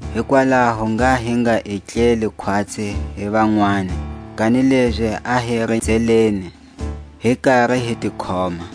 hikwalaho ngha hi nga etleli khwatsi hi vanwani, kanilezi a hi rinzeleni, hi kari hi ti khoma.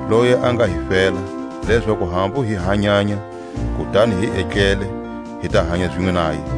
loyi a nga hi fela, lezaku hambu hi hanyanya, kutani hi etlele, hi ta hanya zinwe naye,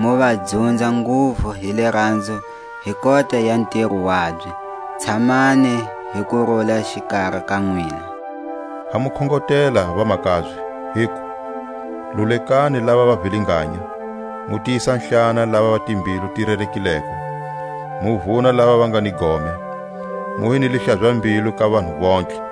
mu va dzunza nguvu hi liranzo hi kota ya ntiro wabye. Tshamani hi kurula xikari ka nwina. Ha mu khongotela, vamakabye, hiku: Lulekani lava va vilinganya, mu tiyisa-hlana lava va timbilu ti rerekileko, mu vuna lava va nga ni gome, mu hi ni lihlaza-mbilu ka vanhu vontlhe.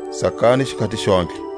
Tsakani xikhati xontlhe.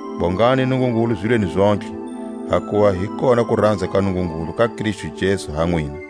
Bongani Nungungulu zilweni zontlhe; hakuva hi kona kuranza ka Nungungulu ka Kristu Jesu ha nwina.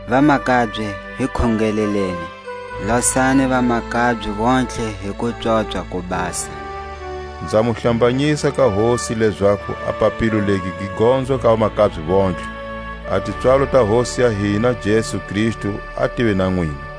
Vamakabye, hi khongeleleni. Losani vamakabye vontlhe hi kupswopswa ko basa. Nza mu hlambanyisa ka Hosi lezaku a papilo legi gi gonzwa ka vamakabye vontlhe. A tipswalo ta Hosi ya hina Jesu Kristu a tive na nwina.